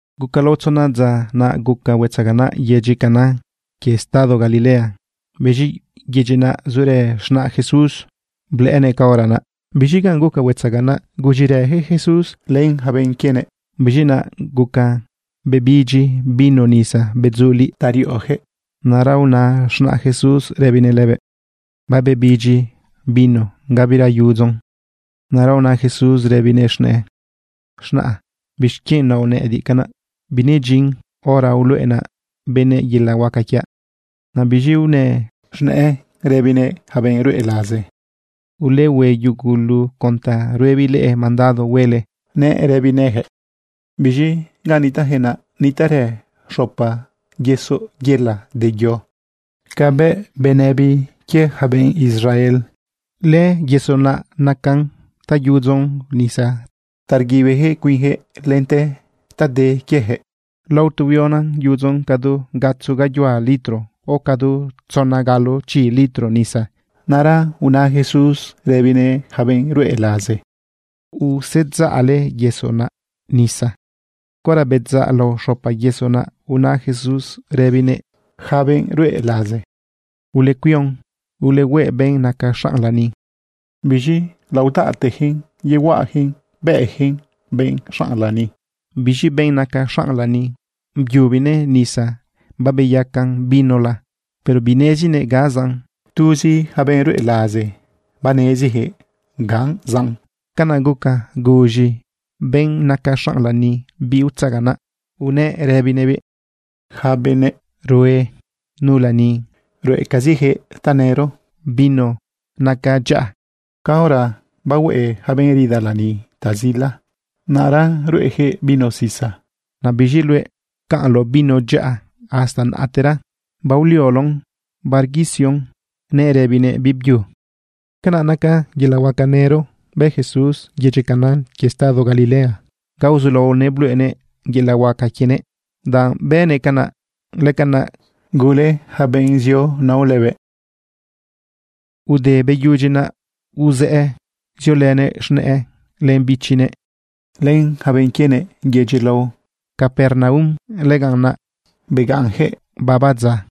Guca lao tzona dza, naꞌ guca huetzaganaꞌ yedyi Caná quie estado Galilea. Biz̃i yedyi naꞌ zurë z̃naꞌ Jesús, blëꞌënëꞌ caora naꞌ. Biz̃i ganꞌ guca huetzaganaꞌ, bërëjëꞌ Jesús invitar len yaca benꞌ quienëꞌ. Biz̃i naꞌ guca bebidyi vino nisa bedzuliꞌ ta riꞌoyaquëꞌ. Naꞌra una z̃naꞌ Jesús rëbinëꞌ lëbëꞌ: ―Babebidyi vino, gabira yudzon. Naꞌra una Jesús rëbinëꞌ z̃nëꞌë: ―Z̃naꞌa, ¿bixquienꞌ naoꞌ nëꞌëdiꞌ canaꞌ? Binedyin hora uluꞌenaꞌ benëꞌ yelaꞌ huaca quiaꞌ. Naꞌ biz̃i unëꞌ z̃nëꞌë rëbinëꞌ yaca benꞌ ruꞌe laze: ―Ulehue yugulu con ta ruebiꞌ leꞌe mandado huele ―nëꞌ rëbinëꞌyaquëꞌ. Biz̃i ganꞌ nitaꞌyaquëꞌ naꞌ, nitaꞌrë xopa yesoꞌ yela de yo. Ca biuꞌ benëbi quie yaca benꞌ Israel, lëyesoꞌ naꞌ nacan ta yudzon nisa ta rguibiyaquëꞌ cuinyaquëꞌ lente ta de quieyaquëꞌ. Lao tu huiona yudzon cadu gatzo gayuhua litro o cadu tzona galo chi litro nisa. Naꞌra una Jesús rëbinëꞌ yaca benꞌ ruꞌe laze: ―Usedzaꞌle yesoꞌ naꞌ nisa. Caora bedzaꞌ lao xopa yesoꞌ, naꞌ una Jesús rëbinëꞌ yaca benꞌ ruꞌe laze: ―Ulecuion, ulehueꞌ benꞌ naca xanꞌ lani. Biz̃i laodaꞌteyaquëꞌn yehuaꞌayaquëꞌn bëꞌyaquëꞌn benꞌ xanꞌ lani. Biz̃i benꞌ naca xanꞌ lani, byubinëꞌ nisa babeyacan vinola, pero binezinëꞌ ga zaꞌn. Tuzi yaca benꞌ ruꞌe laze baneziyaquëꞌ ga zaꞌn. Canaꞌ guca guz̃i benꞌ naca xanꞌ lani biꞌ utzaganaꞌ unëꞌ rëbinëꞌbiꞌ: ―Yaca benëꞌ rue nu lani ruꞌecaziyaquëꞌ tanëro vino naca dyaꞌa. Caora riꞌo yaca benꞌ rida lani ta zila, naꞌ ruꞌeyaquëꞌ vino sisa. Naꞌ biz̃i luëꞌ, pcaꞌnloꞌ vino dyaꞌa hasta naꞌtera baolioloꞌn barequisioꞌn ―nëꞌ rëbinëꞌ biꞌbyu. Canaꞌ naca milagro nëro bë Jesús yedyi Caná quie estado Galilea, ga uzulaonëꞌ bluꞌenëꞌ yelaꞌ huaca quienëꞌ. Danꞌ bënëꞌ canaꞌ, lëcanaꞌ gule yaca benꞌ zio nao lëbëꞌ. Ude beyudyi naꞌ, uzëꞌë ziolënëꞌ z̃nëꞌë, len bichinëꞌ, len yaca benꞌ quienëꞌ yedyi lao Capernaum. Lëganꞌ naꞌ begaꞌnyaquëꞌ baba dza.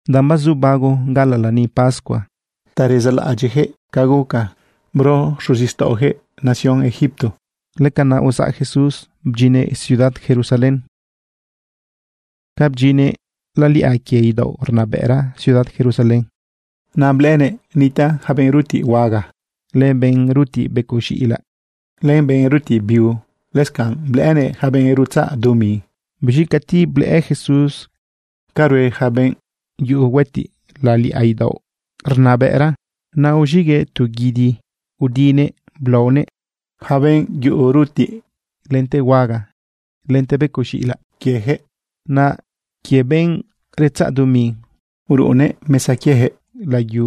Danꞌ bazu bago gaꞌalaꞌ lani pascua ta rezaꞌlaꞌadyiꞌyaquëꞌ ca guca bro xuzixtaꞌoyaquëꞌ nación Egipto, lëcanaꞌ uzaꞌ Jesús bdyinnëꞌ ciudad Jerusalén. Ca bdyinnëꞌ laliꞌa quie idaoꞌ rnabëꞌra ciudad Jerusalén, naꞌ blëꞌënëꞌ nitaꞌ yaca benꞌ rutiꞌ huaga, len benꞌ rutiꞌ becoꞌ z̃iꞌilaꞌ, len benꞌ rutiꞌ biu. Lëscanꞌ blëꞌënëꞌ yaca benꞌ rutzaꞌ dumi. Biz̃i cati blëꞌë Jesús ca rue yaca benꞌ yuꞌu huëtiꞌ laliꞌa idaoꞌ rnabëꞌra, naꞌ uz̃iꞌguëꞌ tu guidi udinëꞌ blaonëꞌ yaca benꞌ yuꞌu rutiꞌ lente huaga lente becoꞌ z̃iꞌilaꞌ quieyaquëꞌ. Naꞌ quie benꞌ retzaꞌ dumi, uruꞌunnëꞌ mesa quieyaquëꞌ layu,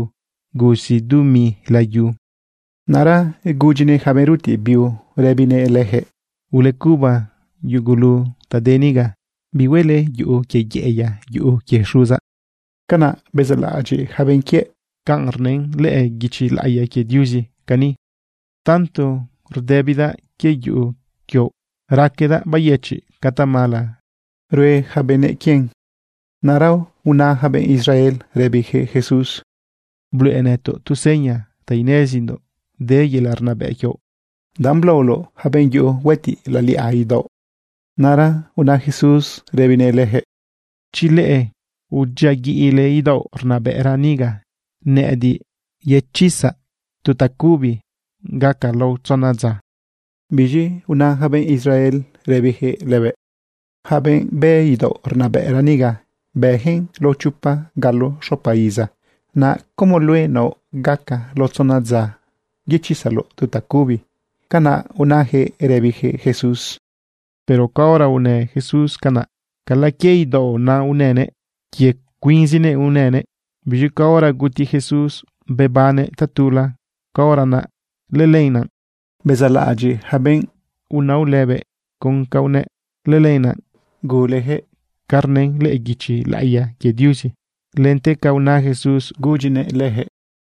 gusi dumi layu. Naꞌra gudyinëꞌ yaca benꞌ rutiꞌ biu rëbinëꞌ leyaquëꞌ: ―¡Ulecuba yugulu ta de niga! ¡Bihuele yuꞌu quie yeꞌeya yuꞌu quie Xuzaꞌ! Canaꞌ bezaꞌlaꞌadyiꞌ yaca benꞌ quiëꞌ canꞌ rnën lëꞌë guichi laꞌiya quie Diuzi cani: “Tanto rdëbidaꞌ quie yuꞌu quioꞌ, raquedaꞌ bayëchiꞌ ca tamala rue yaca benëꞌ quien.” Naꞌra una yaca benꞌ Israel rëbiyaquëꞌ Jesús: ―Bluꞌe nëtoꞌ tu seña ta inezindoꞌ de yelaꞌ rnabëꞌ quioꞌ danꞌ blaoloꞌ yaca benꞌ yuꞌu huëtiꞌ laliꞌa idaoꞌ. Naꞌra una Jesús rëbinëꞌ leyaquëꞌ: ―Chi leꞌe udyiaguiꞌle idaoꞌ rnabëꞌra niga, nëꞌëdiꞌ yechizaꞌ tu tacubi gaca lao tzona dza. Biz̃i una yaca benꞌ Israel rëbiyaquëꞌ lëbëꞌ: ―Yaca benꞌ bë idaoꞌ rnabëꞌra niga, bëyaquëꞌn lao chopa galo xopa iza, ¿naꞌ como luëꞌ naoꞌ gaca lao tzona dza yechizaloꞌ tu tacubi? ―Canaꞌ unayaquëꞌ rëbiyaquëꞌ Jesús. Pero caora unë Jesús canaꞌ, cala quie idaoꞌ naꞌ unënëꞌ, quie cuinzinëꞌ unënëꞌ. Biz̃i caora guti Jesús bebannëꞌ tatula, caora naꞌ lëlenaꞌ bezaꞌlaꞌadyiꞌ yaca benꞌ unao lëbëꞌ con ca unëꞌ. Lëlenaꞌ guleyaquëꞌ ca rnën lëꞌë guichi laꞌiya quie Diuzi lente ca una Jesús gudyinëꞌ leyaquëꞌ.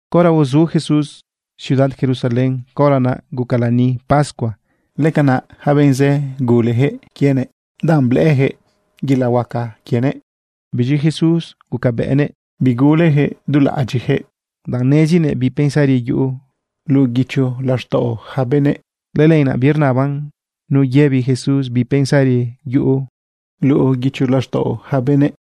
Caora uzu Jesús ciudad Jerusalén, caora naꞌ guca lani pascua. Lëcanaꞌ yaca benꞌ zë guleyaquëꞌ quienëꞌ danꞌ blëꞌëyaquëꞌ yelaꞌ huaca quienëꞌ. Biz̃i Jesús gucabëꞌnëꞌ biguleyaquëꞌ dulaꞌadyiꞌyaquëꞌ, danꞌ nezinëꞌ bi pensari yuꞌu luꞌu guicho laxtaꞌo yaca benëꞌ. Lëlenaꞌ birnaban nu yëbi Jesús bi pensari yuꞌu luꞌu guicho laxtaꞌo yaca benëꞌ.